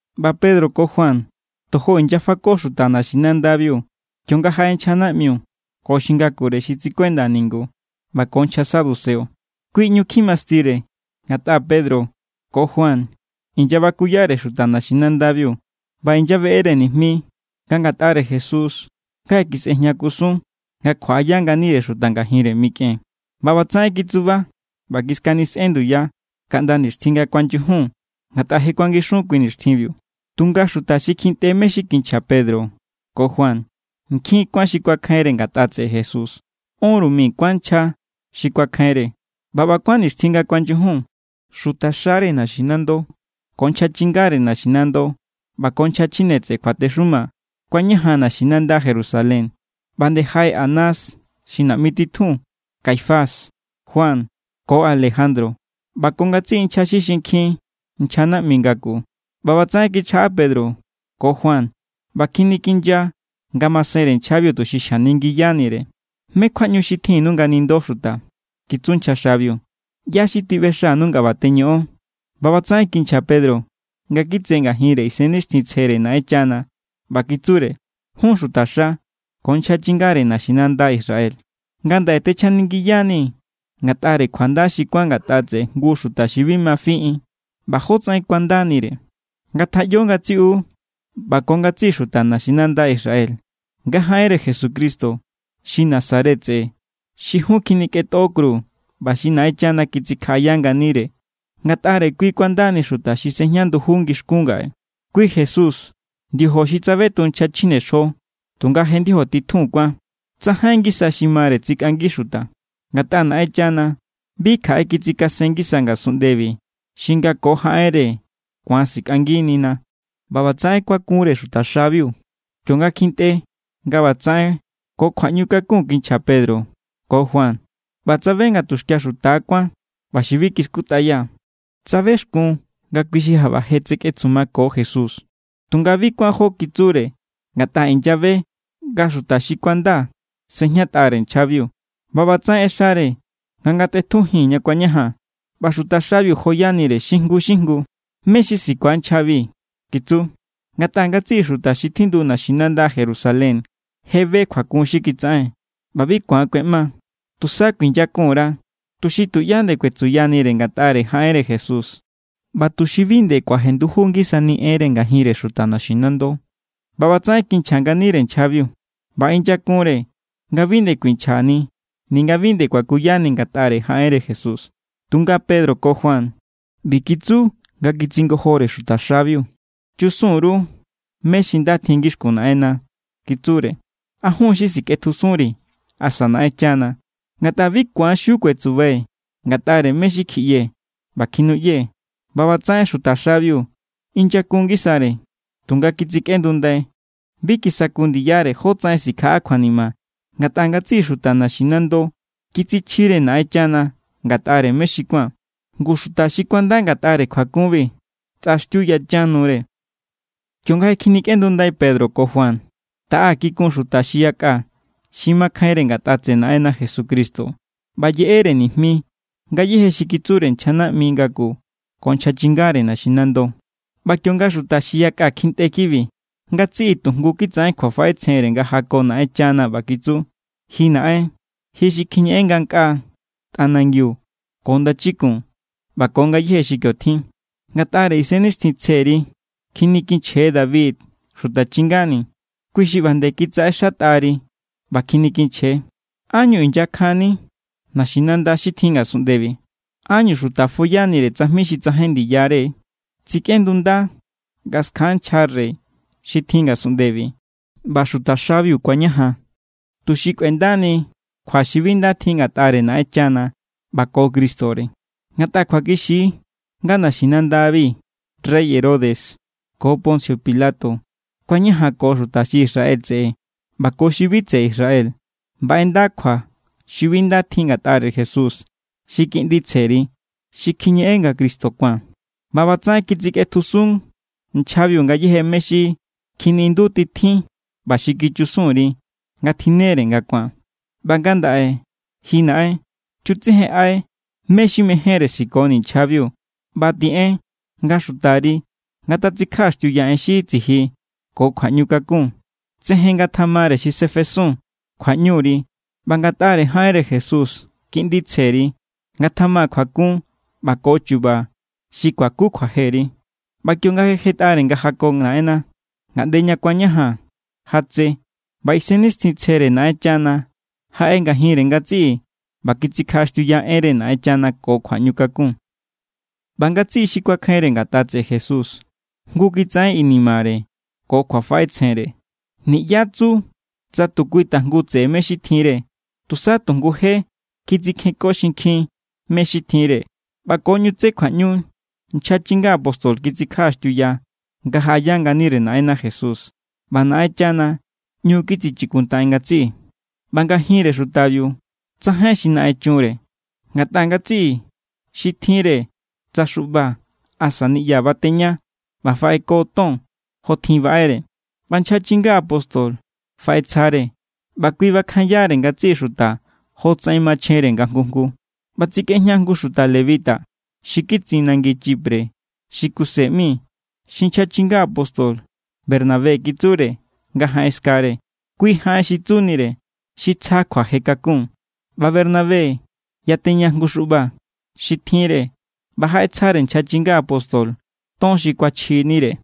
ꞌBa Pedro ko Juan tojo inyafako xuta naxinandabiu kionga jaꞌe nchja naꞌmiu ko xi ngakure xi tsikuenda ningu ꞌba ko nchja saduceo. Kui ꞌñu kjimastire, ngatꞌa Pedro ko Juan inyabakuyare xuta naxinandabiu ꞌba inyaꞌbeꞌere nijmi nga ngatꞌare Jesús nga je kisꞌejña kusun nga kjuaꞌaya nganire xuta ngajinre mikꞌen. ꞌBa ꞌbatsaꞌen kitsuba ꞌba kiskanisꞌen nduya kaꞌnda nixtjin nga kuanyujun, ngatꞌa je kuangixun kui nixtjinbiu. Tunga xuta xi kjintꞌe mé= xi kinchja Pedro ko Juan, nkjin kuán xi kuakjainre ngatꞌa tseꞌe Jesús. Ónru mi kuán nchja xi kuakjainre. ꞌBa ꞌba kuán nixtjin nga kuanyujun, xutaxare naxinando ko nchja chingare naxinando ꞌba ko nchja chjine tseꞌe kjuatexuma kuañajan naxinanda Jerusalén. ꞌBa nde jaꞌe Anás xi naꞌmi titjun, Caifás, Juan, ko Alejandro, ꞌba ko ngatsiꞌi nchja xi xinkjin nchja naꞌmi ngaku. ꞌBa ꞌbatsaꞌen kichjaꞌa Pedro ko Juan ꞌba kjinikinya ngamasenre nchjabiu tuxi xjaningiyanire. —¿Mé= kjuaꞌñu xi tjinnu nga nindo xuta? —kitsu nchja xabiu—. ¿ꞌYá= xi tiꞌbexanu nga ꞌba teñoꞌon? ꞌBa ꞌbatsaꞌen kinchja Pedro nga kitse ngajinre Isennixtjintsjere Naꞌenchana ꞌba kitsure: —Jun xutaxa ko nchja chingare naxinanda Israel, ngandaꞌe techjaningiyanii̱ ngatꞌare kjuanda xi kuán ngatꞌa tseꞌe jngu xuta xi bi ma fiꞌin ꞌba jótsaꞌen kuandanire. Ngatjaꞌyo ngatsiꞌu ꞌba ko ngatsiꞌi xuta naxinanda Israel nga jaꞌenre Jesucristo xi Nazaret tseꞌe xi jun kjinikꞌentꞌo kru ꞌba xi Naꞌenchana kitsikjaꞌaya nganire, ngatꞌare kui kuandani xuta xi sejña nduju ngixkún ngaꞌe. Kui Jesús, ndiojo xi tsabeton nchja chjinexjo tunga je ndiojo titjun kuán. Tsajain ngisa xi mare tsikꞌangi xuta, ngatꞌa Naꞌenchana bi kjaꞌe kitsikasen ngisa ngasunꞌndebi xi nga ko jaꞌenre ku̱an sikꞌanginina. ꞌBa ꞌbatsaꞌen kuakunre xutaxabiu, kionga kjintꞌe nga ꞌbatsaꞌen ko kjuaꞌñu kakun kinchja Pedro ko Juan ꞌba tsabe nga tuxkia xuta= kuán ꞌba xi bi kiskutꞌaya. Tsabexkun nga kui xi jaꞌba je tsekꞌetsumako Jesús. Tunga bi kuán jo kitsure ngatꞌa inyabe nga xuta xi kuanda sejñatꞌare nchjabiu. ꞌBa ꞌbatsaꞌen ꞌexare nga ngatꞌetjujin ña kuañajan, ꞌba xutaxabiu joyanire xi jngu= xi jngu. —¿Mé= xi sikua nchjabi? —kitsu—. Ngatꞌa ngatsiꞌi xuta xi tjindu naxinanda Jerusalén je be kjuakun xi kitsaꞌen, ꞌba bi ku̱an kꞌueꞌma. Tusa kuinyakun_ra, tuxi tuꞌyá nde kuetsuyanire ngatꞌare jaꞌenre Jesús ꞌba tuxi bi nde kuajenduju ngisani enre ngajinre xuta naxinando. ꞌBa ꞌbatsaꞌen kinchja nganire nchjabiu ꞌba inyakunre nga bi nde kuinchjani ninga bi nde kuakuyani ngatꞌare jaꞌenre Jesús. Tunga Pedro ko Juan ꞌbi kitsu nga kitsingojore xutaxabiu: —Chusun_ru mé= xi nda tjin ngixkun Naꞌenna —kitsure—. ¿A jun= xi sikꞌetjusunri̱ asa Naꞌenchana? Ngatꞌa bi ku̱an xiu kuetsubai̱ ngatꞌare mé= xi kjiꞌyee̱ ꞌba kjinuꞌyee̱. ꞌBa ꞌbatsaꞌen xutaxabiu inyakun ngisare, tunga kitsikꞌendundai. Bi kisaku ndiyare jótsaꞌen sikjaꞌa kjuanima, ngatꞌa ngatsiꞌi xuta naxinando kitsichjire Naꞌenchana ngatꞌare mé xi kuán. Ngu xuta xi kuanda ngatꞌare kjuakunbi, tsꞌaxtiu yachan nure. Kionga je kjinikꞌendundai Pedro ko Juan, taꞌa kikun xuta xi yakꞌa xi makjainre ngatꞌa tseꞌe Naꞌenna Jesucristo ꞌba yeꞌere nijmi ngayéje xi kitsure nchja naꞌmi ngaku ko nchja chingare naxinando. ꞌBa kionga xuta xi yakꞌa kjintꞌe kibi, ngatsiꞌi tujngu kitsaꞌen kjuafaꞌetsjenre nga jako Naꞌenchana ꞌba kitsu: —Ji Naꞌen, ji xi kjiñeꞌen ngankꞌaa, tꞌanangiu ko ndachikun ꞌba ko ngayéje xi kio tjin. Ngatꞌare Isennixtjintsjeri kjinikinchje David xuta chingani̱. Kui xi ꞌba nde kitsaꞌexatꞌari ꞌba kjinikinchje: ¿Ánñu inyakjanni naxinanda xi tjin ngasunꞌndebi? ¿Ánñu xuta foyanire tsajmi xi tsajain ndiyare? Tsikꞌendunda nga skjan nchja rey xi tjin ngasunꞌndebi, ꞌba xutaxabiu kuañajan tuxi kꞌuendani kjua xi bi nda tjin ngatꞌare Naꞌenchana ꞌba ko Cristore. ’Ngatꞌa kjuakixi= nga naxinandabi rey Herodes ko Poncio Pilato kuañajanko xuta xi Israel tseꞌe ꞌba ko xi bi tseꞌe Israel ꞌba ꞌenda kjua xi bi nda tjin ngatꞌare Jesús xi Kiꞌndi tsjeri xi kjiñeꞌen nga Cristo kuán. ꞌBa ꞌbatsaꞌen kitsikꞌetjusun nchjabiu ngayéje mé= xi kjiniꞌindutitjin ꞌba xi kichusun_ri nga tjinnere nga ku̱an. ꞌBa ngandaꞌe, ji Naꞌen, chutsejenꞌai mé= xi mejénre sikoni̱ nchjabiu ꞌba tiꞌen nga xutari ngatatsikjaꞌaxtiuya en xi tsiji ko kjuaꞌñukakun. Tsejen ngatamare xi sefesun kjuaꞌñuri, ꞌba ngatꞌare jaꞌenre Jesús, Kiꞌndi tsjeri, ngatjama kjuakun ꞌba ko chu̱ba̱ xi kuaku kjuajeri. ꞌBa kionga je jetꞌare nga jako Naꞌenna, ngaꞌnde ña kuañajan jatse; ꞌba Isennixtjintsjere Naꞌenchana jaꞌe ngajinre ngatsiꞌi, ꞌba kitsikjaꞌaxtiuya enre Naꞌenchana ko kjuaꞌñukakun. ꞌBa ngatsiꞌi xi kuakjainre ngatꞌa tseꞌe Jesús jngu kitsaꞌen inimare ko kjuafaꞌetsjenre. Niꞌyá tsu tsa tu kui tajngu tseꞌe mé= xi tjinre. Tusa tu jngu je kitsikjenko xinkjin mé= xi tjinre. ꞌBa ko ꞌñu tse kjuaꞌñu nchja chinga apóstol kitsikjaꞌaxtiuya nga jaꞌaya nganire Naꞌenna Jesús, ꞌba Naꞌenchana ꞌñu kitsichikuntaꞌen ngatsiꞌi. ꞌBa ngajinre xutabiu tsajain xi naꞌen chunre, ngatꞌa ngatsiꞌi xi tjinre tsa xuꞌba asa niꞌya bateña ꞌba faꞌeko ton jotjin baꞌere. ꞌBa nchja chinga apóstol faꞌetsjare, ꞌba kui bakjanyare ngatsiꞌi xuta jotsaꞌen machjenre nga jngu jngu. ꞌBa tsikꞌejña jngu xuta lebita xi kitsin nangi Chipre xi Kuse ꞌmi, xi nchja chinga apóstol Bernabé kitsure nga jaꞌen skare. (Kui jaꞌen xi tsunire: Xi tsja kjuaje kakun.) ꞌBa Bernabé yateña jngu xuꞌba xi tjinre ꞌba jaꞌetsjare nchja chinga apóstol ton xi kuachjinire.